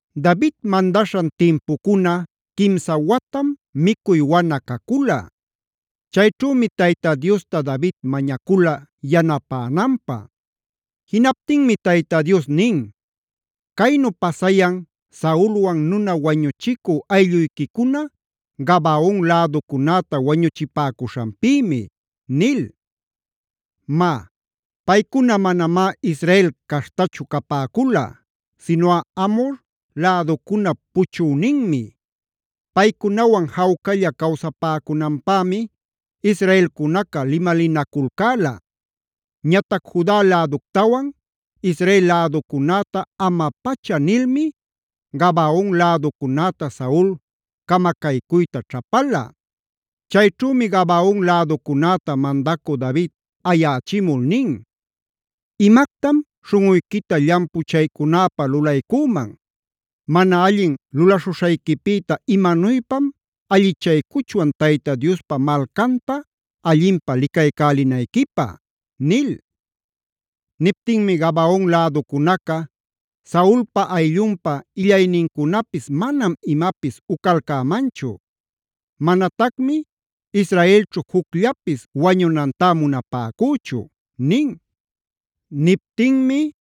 David mandaśhan timpucuna quimsa watam micuy wana cacula. Chayćhümi Tayta Diosta David mañacula yanapänanpä. Jinaptinmi Tayta Dios nin: “Caynu pasayan Saulwan nuna wañuchicü aylluyquicuna Gabaon läducunäta wañuchipäcuśhanpïmi” nil. (Má, paycuna manamá Israel caśhtachu capäcula, sinuꞌa Amhor läducunap puchüninmi. Paycunawan jawcalla cawsapäcunanpämi israelcunaca limalinaculcäla.a Ñatac Juda läductawan Israel läducunäta ama-pacha nilmi Gabaon läducunäta Saul camacaycuyta ćhapala.) Chayćhümi Gabaon läducunäta mandacü David ayächimul nin: “¿Imactam śhuꞌuyquita llampuchaycunäpä lulaycüman? ¿Mana allin lulaśhuśhayquipïta imanuypam allichaycuchwan Tayta Diospa malcanta allinpä licaycälinayquipä?” nil. Niptinmi Gabaon läducunaca: “Saulpa ayllunpa illaynincunapis manam imapis ucalcämanchu. Manatacmi israelćhu jucllapis wañunantá munapäcüchu” nin. Niptinmi: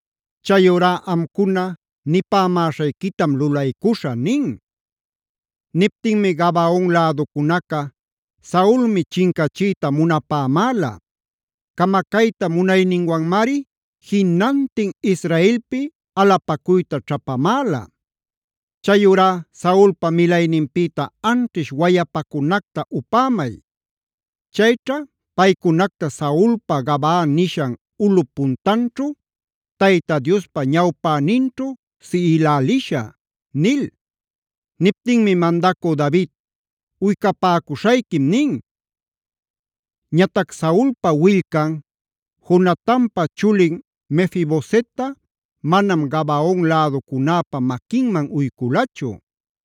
“Chayurá amcuna nipämäśhayquitam lulaycuśhä” nin. Niptinmi Gabaon läducunaca: “Saulmi chincachiyta munapämäla. Camacayta munayninwanmari jinantin Israelpi alapacuyta ćhapamäla. Chayurá Saulpa milayninpïta anćhish wayapacunacta upämay. Chayćha paycunacta Saulpa Gabaa nishan ulꞌup puntanćhu, Tayta Diospa ñawpäninćhu siꞌilälishä” nil. Niptinmi mandacü David: “Uycapäcuśhayquim” nin. Ñatac Saulpa willcan, Jonatanpa chulin Mefi-bosetta manam Gabaon läducunäpa maquinman uyculachu.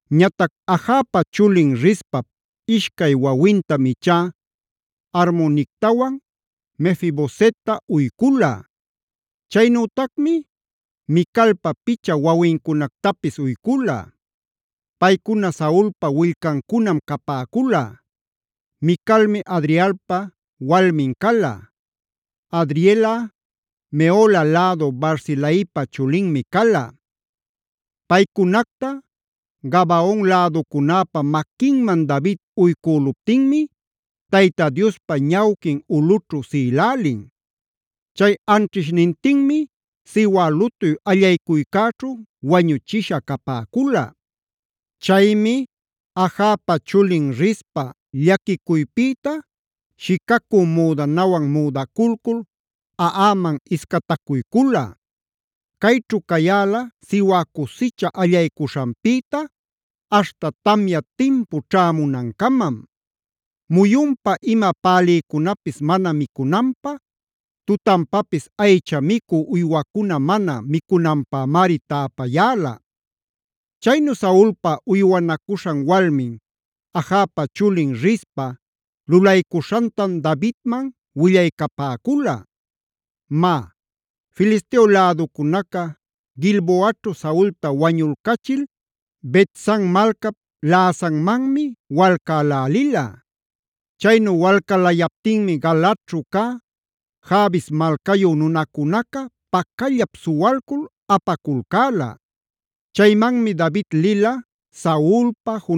Ñatac Ajapa chulin Rizpap ishcay wawintam ichá Armonictawan Mefi-bosetta uycula. Chaynütacmi Micalpa picha wawincunactapis uycula. Paycuna Saulpa willcancunam capäcula. Micalmic Adrielpa walmin cala; Adrielꞌa Mehola lädu Barzilaipa chulinmi cala. Paycunacta Gabaon läducunäpa maquinman David uycüluptinmi Tayta Diospa ñawquin ulꞌućhu siꞌilälin. Chay anćhishnintinmi siwä lutuy allaycuycäćhu wañuchisha capäcula. Chaymi Ajapa chulin Rizpa llaquicuypïta shicacü müdanawan müdaculcul aꞌaman iscatacuycula. Cayćhu cayäla siwä cusicha allaycuśhanpïta aśhta tamya timpu ćhämunancamam. Muyunpa ima pälïcunapis mana micunanpä, tutanpapis aycha micü uywacuna mana micunanpämari täpayäla. Chaynu Saulpa uywanacuśhan walmin, Ajapa chulin Rizpa lulaycuśhantam Davidman willaycapäcula. Má, Filisteo läducunaca Gilboaćhu Saulta wañulcachil Bet-san malcap läsanmanmi walcälälila. Chaynu walcalayaptinmi Galaadćhu cä Jabes malcayu nunacunaca pacallap suwalcul apaculcäla. Chaymanmi David lila Saulpa,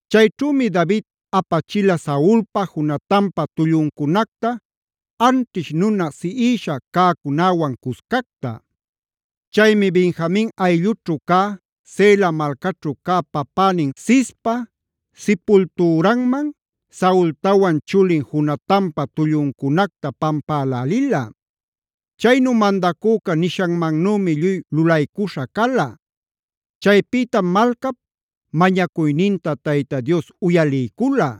Chayćhümi David apachila Saulpa, Jonatanpa tulluncunacta, anćhish nuna siꞌisha cäcunäwan cuscacta. Chaymi Benjamin ayllućhu cä, Zela malcaćhu cä papänin Cispa sipultüranman Saultawan chulin Jonatanpa tulluncunacta pampälälila. Chaynu mandacüca nishanmannümi lluy lulaycuśha cala. Chaypïtam malcap mañacuyninta Tayta Dios uyaliycula.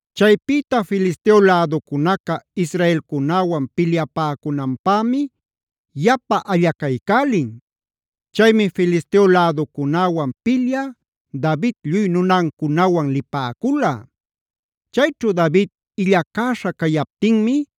Chaypïta Filisteo läducunaca israelcunäwan pilyapäcunanpämi yapa allacaycälin. Chaymi Filisteo läducunäwan pilyä David lluy nunancunawan lipäcula. Chayćhu David illacäśha cayaptinmi,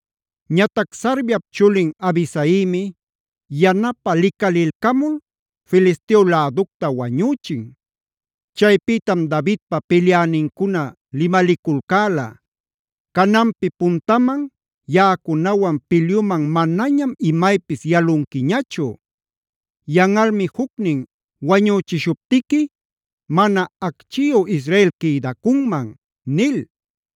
Ñatac Sarviap chulin Abisaimi yanapä licalilcamul Filisteo läducta wañüchin. Chaypïtam Davidpa pilyänincuna limaliculcäla: “Cananpi puntaman yaꞌacunawan pilyuman manañam imaypis yalunquiñachu. Yanꞌalmi jucnin wañüchishuptiqui mana acchiyu Israel quïdacunman” nil.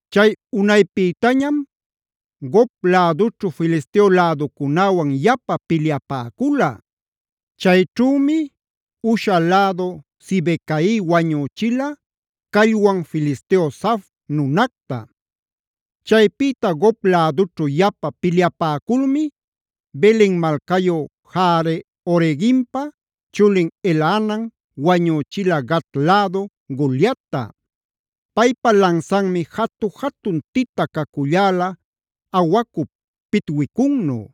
Chay unaypïtañam Gob lädućhu Filisteo läducunäwan yapa pilyapäcula. Chayćhümi Husha lädu Sibecai wañüchila callwan Filisteo Saf nunacta. Chaypïta Gob lädućhu yapa pilyapäculmi Belen malcayu Jaare-oregimpa chulin Elhanan wañüchila Gat lädu Goliatta.e Paypa lansanmi jatu-jatun tita caculläla awacup pitwicunnu.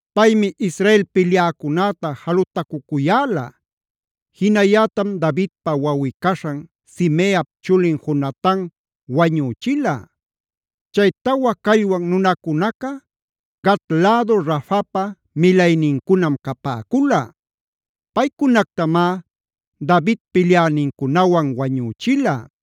Paymi Israel pilyäcunäta jalutacucuyäla. Jinayätam Davidpa wawꞌi-caśhan Simeap chulin Jonatan wañüchila. Chay tawa callwan nunacunaca Gat lädu Rafapa milaynincunam capäcula. Paycunactamá David pilyänincunawan wañüchila.